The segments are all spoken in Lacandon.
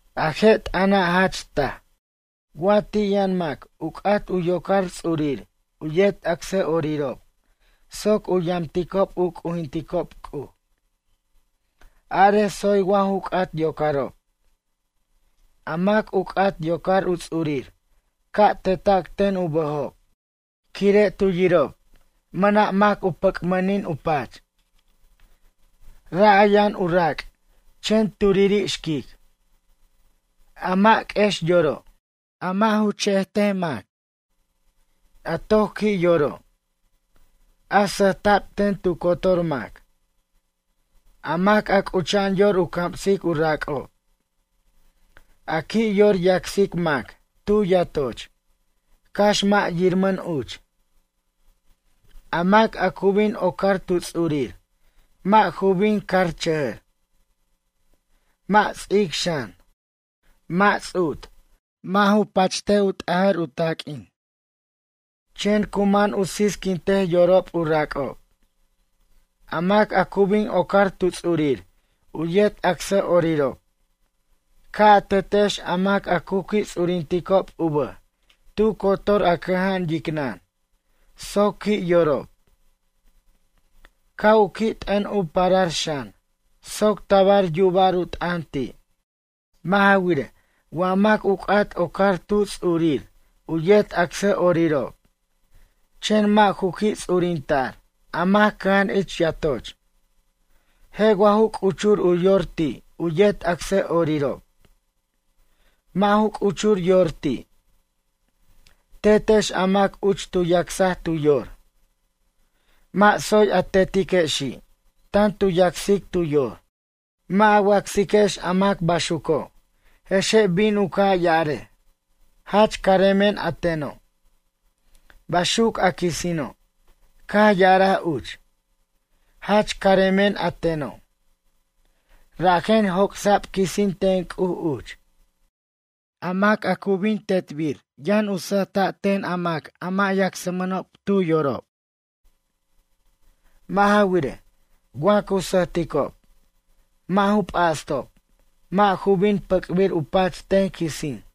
A je' t'ʌna' jach taj. Wa ti' yʌn mac u c'at u yocar ts'urir u yet acsʌ'orirob soc u yamticob u c'ujinticob C'uj. Arej tsoy wa ju c'at yocarob. A mac u c'at yocar u ts'urir ca' teta'c ten u bʌjob quire' tu yirob mʌna' mac u pʌc'mʌnin u pach. Ra' a yʌn u rac' chen turiri' xquic. A mʌ' q'uex yoro'. A mʌ' u che'ej ten mac. A toc qui' yoro'. A sʌjta'b ten tu cotor mac. A mac a c'ucha'an yor u camsic u rac'ob. A qui' yor yacsic mac tu yatoch, cax mʌ' yirmʌn uch. A mac a cu bin ocar tu ts'urir mʌ' ju bin carchʌjʌr. Mʌ' ts'ic xan. Mʌ' ts'ut, mʌ' ju pacht u t'ajar u taq'uin. Chen cu man u sisquintej yorob u rac'ob. A mac a cu bin ocar tu ts'urir u yet acsʌ'orirob. Ca' a tetex a mac cu qui' ts'urinticob u bʌj tu cotor a cʌja'an yicnʌn soc qui' yorob. Ca' u qui' t'ʌn u parar xan soc tabar yuba'r u t'ʌn ti'. Mʌ' ja wirej, wa mac u c'at ocar tu ts'urir u yet acsʌ'orirob. Chen mʌ' ju qui' ts'urinta'r a mac cʌja'an ich yatoch, je' wa ju c'uchur u yor ti' u yet acsʌ'orirob? Mʌ' ju c'uchur yor ti'. Tetex a mac uch tu yacsaj tu yor. Mʌ' tsoy a tetiquexi', tan tu yacsic tu yor. Mʌ' a wacsiquex a mac baxuco' je'xe' bin u ca' ya'arej: ―Jach caremen a teno'. Baxuc a quisino' caj ya'araj uch: ―Jach caremen a teno'. Rajen joc'sa'b quisin ten C'uj uch. A mac a cu bin tetbir yʌn sʌjta' ten a mac a mʌ' yacsmʌnob tu yorob. Mʌ' ja wirej, wa cu sʌjticob, mʌ' ju p'astob mʌ' ju bin pʌc'bir u pach ten quisin.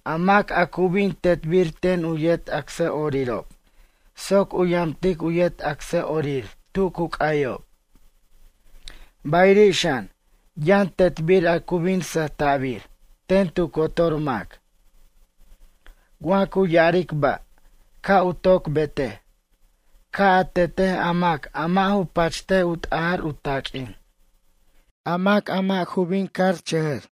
A mac a cu bin tetbir ten u yet acsʌ'orirob soc u yamtic u yet acsʌ'orir tu cu c'ayob. Bayiri' xan yʌn tetbir a cu bin sʌjta'bir ten tu cotor mac. Wa cu ya'aric ba', ca' u toc betej, ca' a tetej a mac a mʌ' ju pachtej u t'ajar u taq'uin. A mac a mʌ' ju bin carchʌjʌr.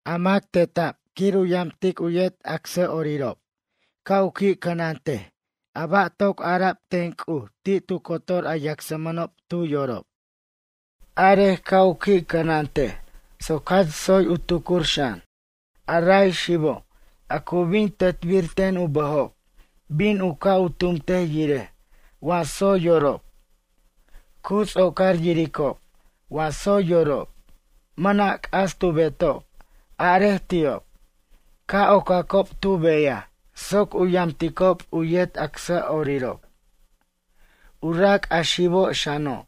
A mac teta'b quir u yamtic u yet acsʌ'orirob ca' u qui' cʌnantej ba' toc ara'b ten C'uj ti' tu cotor a yacsmʌnob tu yorob. Arej ca' u qui' cʌnantej soc jach tsoy u tucur xan. A ra' xibo' a cu bin tetbir ten u bʌjob bin u ca' u tumtej yirej wa tsoy yorob. Cu ts'ocar yiricob wa tsoy yorob, mʌna' c'as tu betob arej ti'ob, ca' ocacob tu beyaj soc u yamticob u yet acsʌ'orirob. U rac' a xib xano'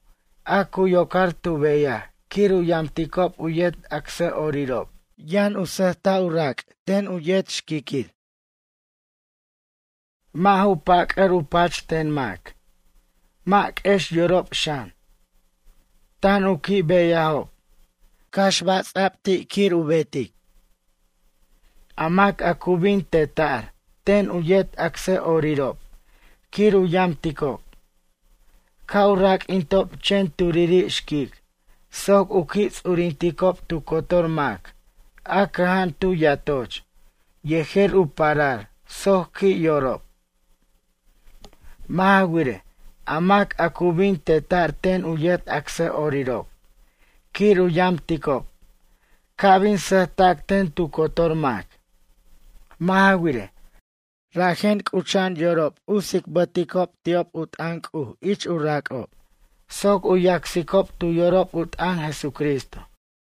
a cu yocar tu beyaj quir u yamticob u yet acsʌ'orirob yʌn sʌjta' u rac' ten u yet xquiqui'. Mʌ' ju pʌc'ar u pach ten mac. Mʌ' q'uex yorob xan. Tan u qui' beyajob, cax ba' ts'a'b ti' quir u betej. A mac a cu bin teta'r ten u yet acsʌ'orirob quir u yamticob. Ca' u raq'uintob chen turiri' xquic soc u qui' ts'urinticob tu cotor mac a cʌja'an tu yatoch yejer u parar soc qui' yorob. Mʌ' ja wirej, a mac a cu bin teta'r ten u yet acsʌ'orirob quir u yamticob, ca' bin sʌjtac ten tu cotor mac. Mʌ' ja wirej, rajen c'ucha'an yorob u tsicbʌticob ti'ob u t'ʌn C'uj ich u rac'ob, soc u yacsicob tu yorob u t'ʌn Jesucristo.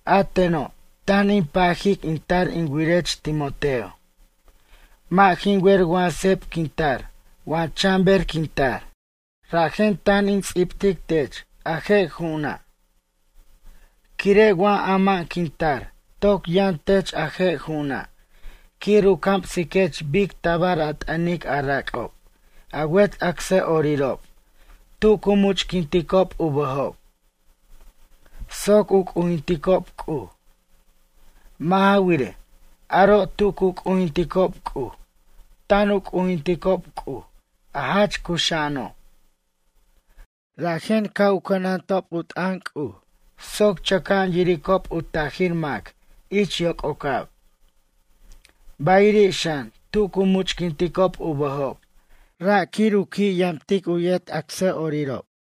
A teno' tan in pajic in tar in wirech Timoteo. Mʌ' jin wer wa seb quin tar wa chan ber quin tar. Rajen tan in ts'ibtic tech a je' ju'una'. Quire' wa ama'an quin tar toc yʌn tech a je' ju'una' quir u camsiquech bic tabar a t'ʌnic a rac'ob a wet acsʌ'orirob tu cu much'quinticob u bʌjob. Soc u c'ujinticob C'uj. Mʌ' ja wirej, aro' tu cu c'ujinticob C'uj tan u c'ujinticob C'uj a jach cuxa'ano'. Rajen ca' u cʌnantob u t'ʌn C'uj soc chʌca'an yiricob u tajir mac ich yoc'ocab. Bayiri' xan tu cu much'quinticob u bʌjob ra' quir u qui' yamtic u yet acsʌ'orirob.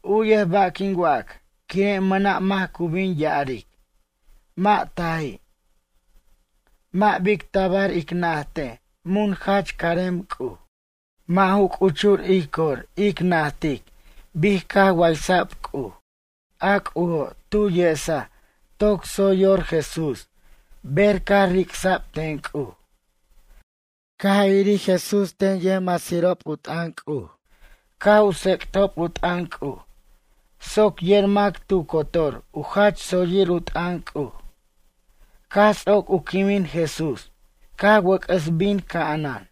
U'yej ba' quin wac quire' mʌna' mac cu bin ya'aric: ―Mʌ' taji'. Mʌ' bic tabar ic najtej mun jach carem C'uj. Mʌ' ju c'uchur ij cor ic najtic bic caj waysa'b C'uj. A C'ujo' tu yesaj toc tsoy yor Jesús ber caj ricsa'b ten C'uj. Caj irir Jesús ten yʌjmasirob u t'ʌn C'uj caj u tsec'tob u t'ʌn C'uj soc yer mac tu cotor u jach tsoyir u t'ʌn C'uj. Caj ts'oc u quimin Jesús caj wʌc'ʌs bin ca'anan.